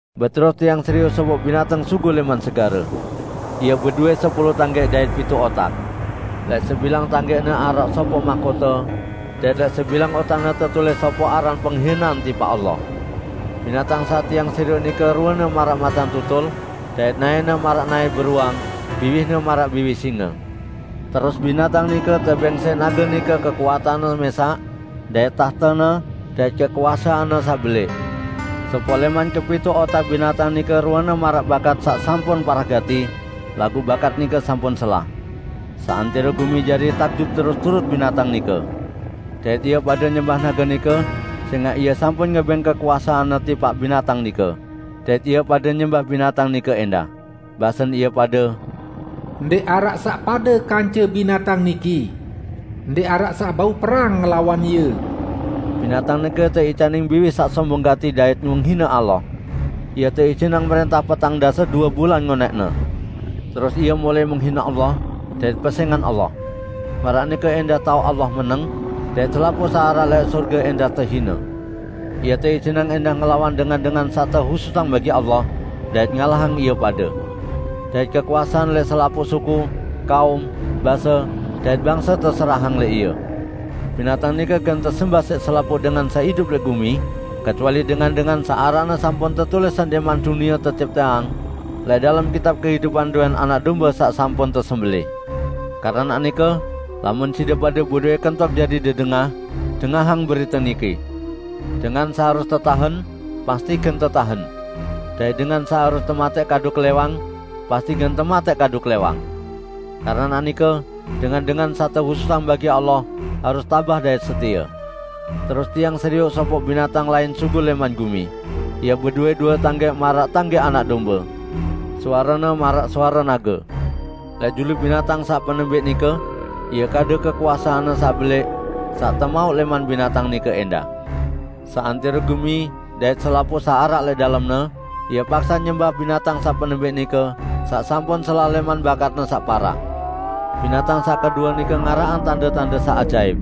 Beterus tiang serioq sopoq binatang sugul lẽman segare. Ie bedowẽ sepulu tanggẽq dait pituq otak. Lẽq sebilang tanggẽqne araq sopoq mahkote, dait lẽq sebilang otakne tetulis sopoq aran penghinean tipaq Allah. Binatang saq tiang serioq nike ruene maraq macan tutul, dait naẽne maraq naẽ beruang, biwihne maraq biwih singe. Terus binatang nike tebẽng siq nage nike kekuatanne mẽsaq, dait tahtene, dait kekuaseanne saq belẽq. Sopoq lẽman kepituq otak binatang nike ruene maraq bakat saq sampun parah gati, laguq bakat nike sampun selah. Seantẽro gumi jari takjub terus turut binatang nike. Dait ie pade nyembah nage nike sẽngaq ie sampun ngebẽng kekuaseanne tipaq binatang nike. Dait ie pade nyembah binatang nike ẽndah. Basen ie pade, "Ndẽq araq saq pade kance binatang niki! Ndẽq araq saq bau perang ngelawan ie!" Binatang nike teicanin biwih saq sombong gati dait menghine Allah. Ie teijinang mrẽntah petang dase due bulan ngonẽqne. Terus ie mulai menghine Allah, dait pesẽngan Allah. Maraq nike ẽndah taoq Allah meneng, dait selapuq saq araq lẽq sorge ẽndah tehine. Ie teijinang ẽndah ngelawan dengan-dengan saq tehususang bagi Allah dait ngalahang ie pade. Dait kekuasean lẽq selapuq suku, kaum, base, dait bangse teserahang lẽq ie. Binatang nike gen tesembah siq selapuq dengan saq idup lẽq gumi, kecuali dengan-dengan saq aranne sampun tetulis sendẽqman dunie tecipteang, lẽq dalem kitab kehidupan dowẽn Anak Dombe saq sampun tesembelẽh. Keranaq nike, lamun side pade bedowẽ kentok jari dedengah, dengahang berite niki: "Dengan saq harus tetahen, pasti gen tetahen. Dait dengan saq harus tematẽq kadu klẽwang, pasti gen tematẽq kadu klẽwang. Keranaq nike dengan-dengan saq tehususang bagi Allah harus tabah dait setie." Terus tiang serioq sopoq binatang lain sugul lẽman gumi. Ie bedowẽ due tanggẽq maraq tanggẽq anak dombe. Suarene maraq suare nage. Lẽq julu binatang saq penembẽq nike ie kadu kekuaseanne saq belẽq saq temauq lẽman binatang nike ẽndah. Seantẽro gumi dait selapuq saq araq lẽq dalemne, ie paksaq nyembah binatang saq penembẽq nike, saq sampun selah lẽman bakatne saq parah. Binatang saq kedue nike ngaraqang tande-tande saq ajaip.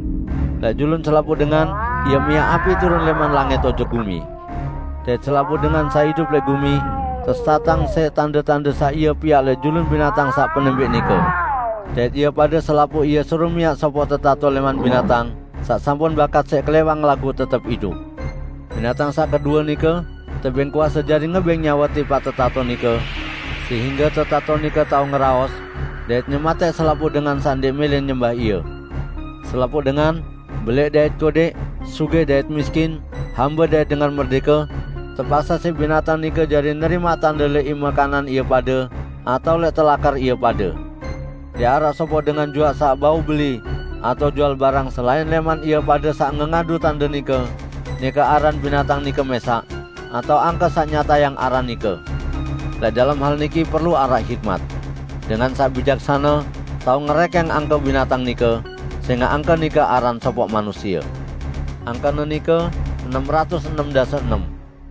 Lẽq julun selapuq dengan ie miaq api turun lẽman langit ojok gumi. Dait selapuq dengan saq idup lẽq gumi tesesatang siq tande-tande saq ie piaq lẽq julun binatang saq penembẽq nike. Dait ie pade selapuq ie suruq miaq sopoq tetato lẽman binatang saq sampun bakat siq klẽwang laguq tetep idup. Binatang saq kedue nike tebẽng kuase jari ngebẽng nyawe tipaq tetato nike, sehingge tetato nike tao ngeraos, dait nyematẽq selapuq dengan saq ndẽq mẽlẽ nyembah ie. Selapuq dengan, belẽq dait kodẽq, sugih dait miskin, hambe dait dengan merdẽke, tepaksaq siq binatang nike jari nerimaq tande lẽq ime kanan ie pade atao lẽq telakar ie pade. Ndẽq araq sopoq dengan juaq saq bau beli atao jual barang selain lẽman ie pade saq ngengadu tande nike, nike aran binatang nike mẽsaq, atao angke saq nyatayang aran nike. Lẽq dalem hal niki perlu araq hikmat. Dengan saq bijaksane tao ngerẽkẽng angke binatang nike, sẽngaq angke nike aran sopoq manusie. Angkene nike enem ratus enem dase enem.